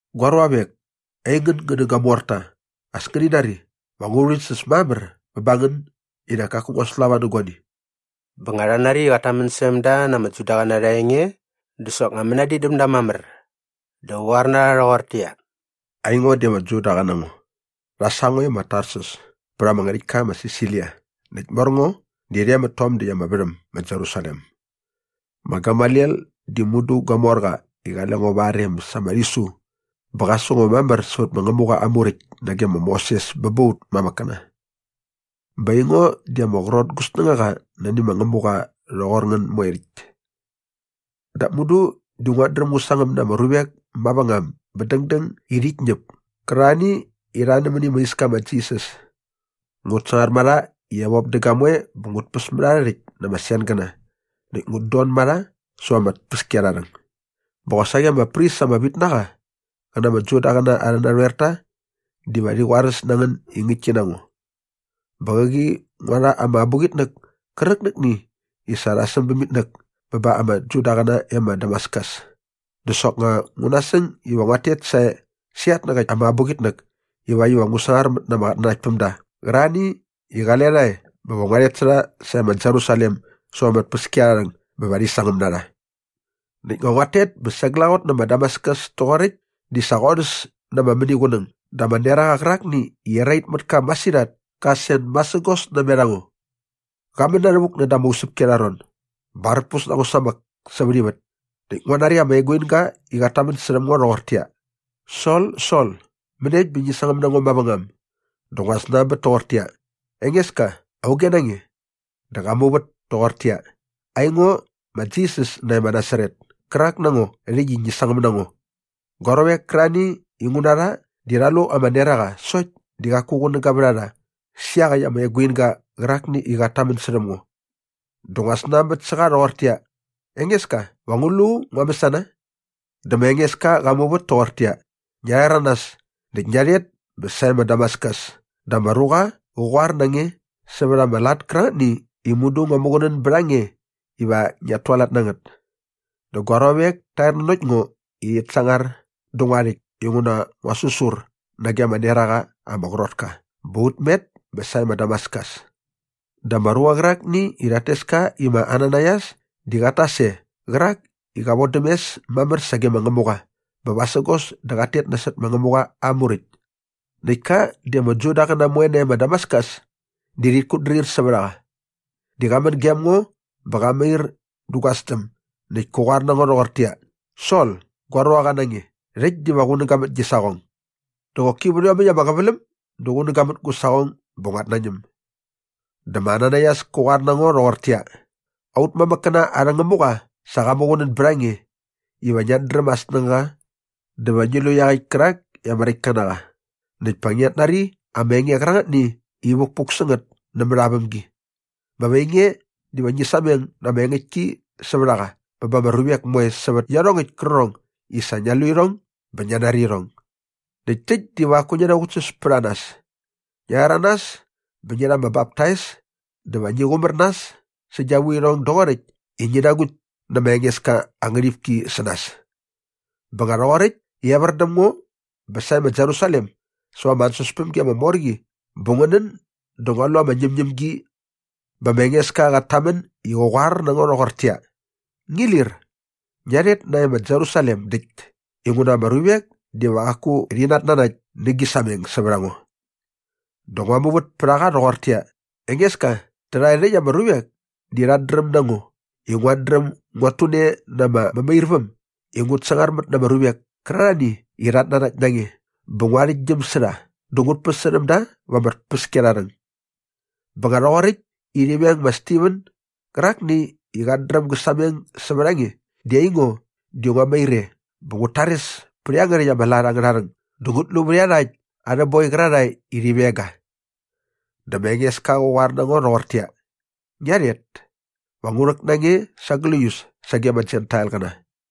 “Gua ruavek, aingän ngän nä gua morta, as ngäni nari, va ngu rhäväktsäs mamär bä ba ngän i nak kaku ngua slava nä guani.” Bä nga rha nari i qat tamän särhäm da na ama Judaqäna arha enge dä soknga mänadin däm da mamär. Dä qä qoar na rha rhoqortäqyia, “Aingo di ama Judaqa na ngo. Rha sa ngo e ma Tarsus pät ama ngärhäktka ma Silisia näkt mor ngo di rhe mät tom däkt ama värhäm ma Jerusalem. Ma Gamaliel di mudu gua morqa i qale ngo va aa rem sa ama rhisu bä qa su ngo mamär sävät ma Ngämuqa aa Muräkt nage ma Moses bä ba aut mamäkkäna. Bä aingo di ama qrot gu snängaqa mäni ma Ngämuqa rhoqor ngän moe rhäkt. “Dap mudu di nguat dräm ngu sangäm na ama ruvek mavängam bä dängdäng i rhit ñäp kärarhani i rha nämäni ma Iska i ma Jisas. Ngut sangar ma rha i evop dä gamoe bä ngut päs mät arhä rhäkt na ama sengäna näkt ngut don ma rha säva ama tpäskiarharhäng bä qosaqi ama pris ama vit na qa qä na ama Judaqäna arhä narhoerta diva rhi qoaräs na ngän i ngäktki na ngo. Bä qäqi ngua rha ama abuqitnäk kärqitnäkni i sa rha säm bäm itnäk bä ba ama Judaqäna e ma Damaskus. Dä soknga ngu nasäng iva nguat tet sae sä iatnäqäkt ama abuqitnäk ivakt iva ngu sangar mät na ama qatnanaktpämda qärarhani i qale rha e bä va ngua rhet sä rha sarhe ma Jerusalem säva ama tpäskiarharhäng bä va rhi sangäm na rha. “Näkt nga nguat tet bä sa glaqot nä ma Damaskus toqoräkt di sa qorhäs na ama mäniqunäng dä ama neraqa qärakni i erait mät ka masirhat kä sen masägos namet a ngo. Qa män na rhävuk näda ama usäpki arha ron. Bä arpus na ngo samäk sävät ivät näkt ngua nari ama eguinga i qat tamän särhäm ngo rhoqortäqyia, ‘Sol, Sol, mäniekt bä ngi sangäm na ngo mavängam?’ “Dä ngua snanbät toqortäqyia, ‘Engeska, auge na nge?’ “Dä qa muvät toqortäqyia, ‘Aingo ma Jisas nae ma Nasaret kärak na ngo rhäkt i ngi sangäm na ngo.’ Gua ruavek kärarhani i ngu na rha di rha lu ama neraqa sokt di qaku qunäga vät a rha sä iaqäkt aa eguinga qärakni i qat tamän särhäm ngo. “Dä ngua snanbät sä qa rhoqortäqyia, ‘Engeska, va ngu lu ngua mäsana?’ “Dä ma Engeska qa muvät toqortäqyia, ‘Ngia rhäranas näkt ngia rhet bä sae ma Damaskus dä ama ruqa va qä qoar na nge sävät ama lat kärangätni i mudu ngua muqunän bät a nge iva ngiat tualat na ngät.’ Dä gua ruavek ta er nanokt ngo i rhit sangar dä ngua rhäkt inguna ngua säsur nage ama neraqa ama qrot ka bä ut met bä sae ma Damaskus. “Dä ama ruqa qärakni i rhat tes ka i ma Ananaias di qat tas e qärak i qa vodäm mes mamär sage ma Ngämuqa bä vasägos dä qat tet nasot ma Ngämuqa aa Muräkt. Näkt ka di ama Judaqäna moe nae ma Damaskus di rhit kutdrir sävät a qa. Di qa män gem ngo bä qa mair dä gua sdäm näkt kä qoar na ngo rhoqortäqyia, ‘Sol, gua ruaqa na nge, rhäkt diva qunäga mät gi saqong.’ “Dä qoki vät iomäkt ama qäväläm dä qunäga mät gu saqong bä nguat nañäm. Dä ma Ananaias kä qoar na ngo rhoqortäqyia, ‘Aut mamäkkäna arhä Ngämuqa sa qa muqunän bät a nge iva ngiat dräm aa snängaqa dä va ngi lu iaqäkt kärak i ama Räktka na qa näkt pa ngiat nari ama enge qärangätni i vukpuk sä ngät nämät aa vämgi. Bä va ainge diva ngi sameng na ama engäktki sävät a qa bä ba ama ruvek moe sävät iarhongäkt kärqärhong i sa ngia lu irhong bä ngia nari irhong. Näkt täkt diva qaku ngi naqutsäs pät a nas. Ngia rhäranas bä ngi rha ama baptais dä va ngi qumär nas sä gia vuirhong doqoräkt i ngi nagukt nä ma Engeska aa ngärhipki sä nas.’ “Bä nga rhoqoräkt i evär däm ngo bä sae ma Jerusalem säva ama ansäspämgi ama mor qi bä ngu nän dä ngua lu ama ñämñämgi bä ma Engeska qat tamän i qä qoar na ngo rhoqortäqyia, ‘Ngi lir! Ngia rhet nae ma Jerusalem däkt inguna ama ruvek diva qaku rhi natnanakt nä gi sameng sävät a ngo.’ “Dä ngua muvät pät a qa rhoqortäqyia, ‘Engeska, tärhae rhäkt ama ruvek di rhat dräm na ngo i nguat dräm nguat tune na ama mämairväm i ngut sangarmät na ama ruvek kärarhani i rhat nanakt na nge bä ngu arhäktgyäm sä rha dä ngut päsärhäm da va ama tpäskiarharhäng. Bä nga rhoqoräkt i rhi veng ma Stiven gärakni i qat dräm gä sameng sävät a nge di aingo di nguat mair e bä ngut tares pät iangärhäkt ama lat angärha rhäng dä ngut lu vät iarhakt arhä boi qärarhae i rhi veng ga.’ “Dä ma Engeska qa qoar na ngo rhoqortäqyia, ‘Ngia rhet. Va ngu rhäk na nge sa gläius sage ama Jentailqäna.’”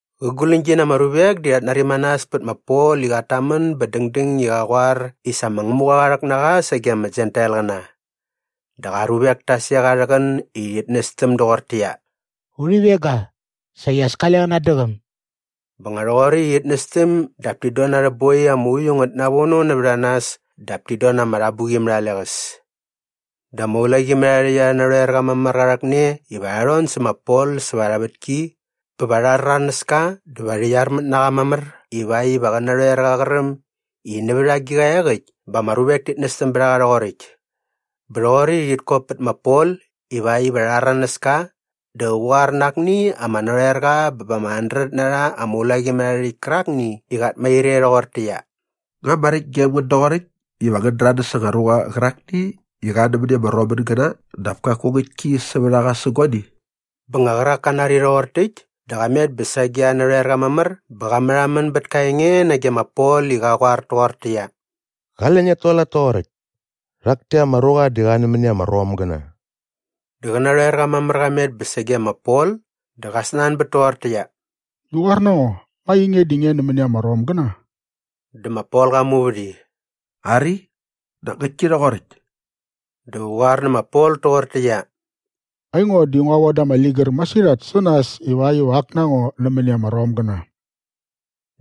Qä guläñgi na ama ruvek di rhat nari manas pät ma Pol i qat tamän bä dängdäng i qa qoar i sa ma Ngämuqa qa rhäk na qa sage ma Jentailqäna. Dä qa ruvek ta sek sa arhä qän i rhit nästäm doqortäqyia, “Urhi veng ga! Saqi as kale qä natdäqäm!” Bä nga rhoqoräkt i rhit nästäm dap tit don na arhä boi ama uiu ngät navono nävät a nas dap tit don na ama rhabuqi mät a leqäs. Dä ama ulaqimärharhärhäkt arhä narhoerqa mamär qa rhäkne iva rha rhon sä ma Pol säva arha vätki bä va rha rhäranäs ka dä va rhi qyarmät na qa mamär ivakt iva qä narhoerqa qä räm i nävät agiqa iaqäkt bä ama ruvek tit nästäm bät a qa rhoqoräkt. Bä rhoqoräkt i rhit kop pät ma Pol ivakt iva rha rhäranäs ka dä qä qoar na akni ama narhoerqa bä ba ama handret na rha ama ulaqimärharhärhäkt kärakni i qat mair e rhoqortäqyia, “Nga maräkt gem ngän doqoräkt iva ngän däranäs anga ruqa qärakni i ak na qa nämäni ama Romgäna dap kaku ngäktki sävät a qa sä guani?” Bä nga qärak ka nari rhoqor täkt dä qa met bä sage aa narhoerqa mamär bä qa märhamän bät ka enge nage ma Pol i qa qoar toqortäqyia, “Qale ngiat tualat toqoräkt! Rhak täkt ama ruqa di qa nämäni ama Romgäna.” Dä qä narhoerqa mamär qa met bä sage ma Pol dä qa snanbät toqortäqyia, “Ngi qoar na ngo, nga ainge di nge nämäni ama Romgäna?” Dä ma Pol qa muvät i, “Ari, nak ngäktki rhoqoräkt.” Dä qä qoar nä ma Pol toqortäqyia, “Aingo di ngua voda ama ligär masirhat sä nas ivakt iva ak na ngo nämäni ama Romgäna.”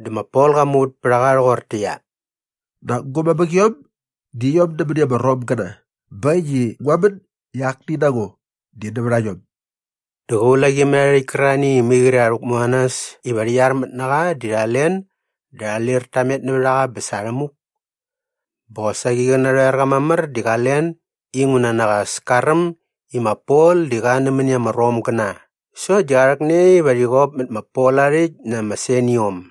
Dä ma Pol qa muvät pät a qa rhoqortäqyia, “Nak gu mamäqiom di iom nämäni ama Romgäna bä äkt i ngua män i akni na ngo di nävät a iom.” Dä qä ulaqimärharhärhäkt kärarhani i mai qre rha rhäkmu na nas iva rhi qyarmät na qa di rha len dä rha lir ta met nävät a qa bä sa rhänamuk. Bä qosaqi qä narhoerqa mamär di qa len inguna nak as ka räm i ma Pol di qa nämäni ama Romgäna sokt di qa rhäkne iva rhi qop mät ma Pol aa rhäkt na ama seniom.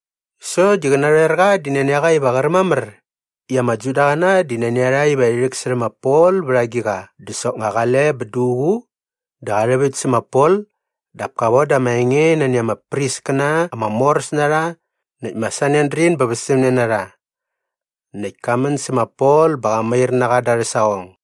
Sokt di qä narhoerqa di nani a qa iva qä räm mamär i ama Judaqäna di nani a rha iva rhi rhäksärhä ma Pol vät agiqa dä soknga qale bä duququ dä qa rhäväkt sä ma Pol dap ka voda ama enge nani ama priskäna ama moräs na rha näkt ma Sanedrin bä västämne na rha. Näkt ka män sä ma Pol bä qa mair na qa da arhä saqong.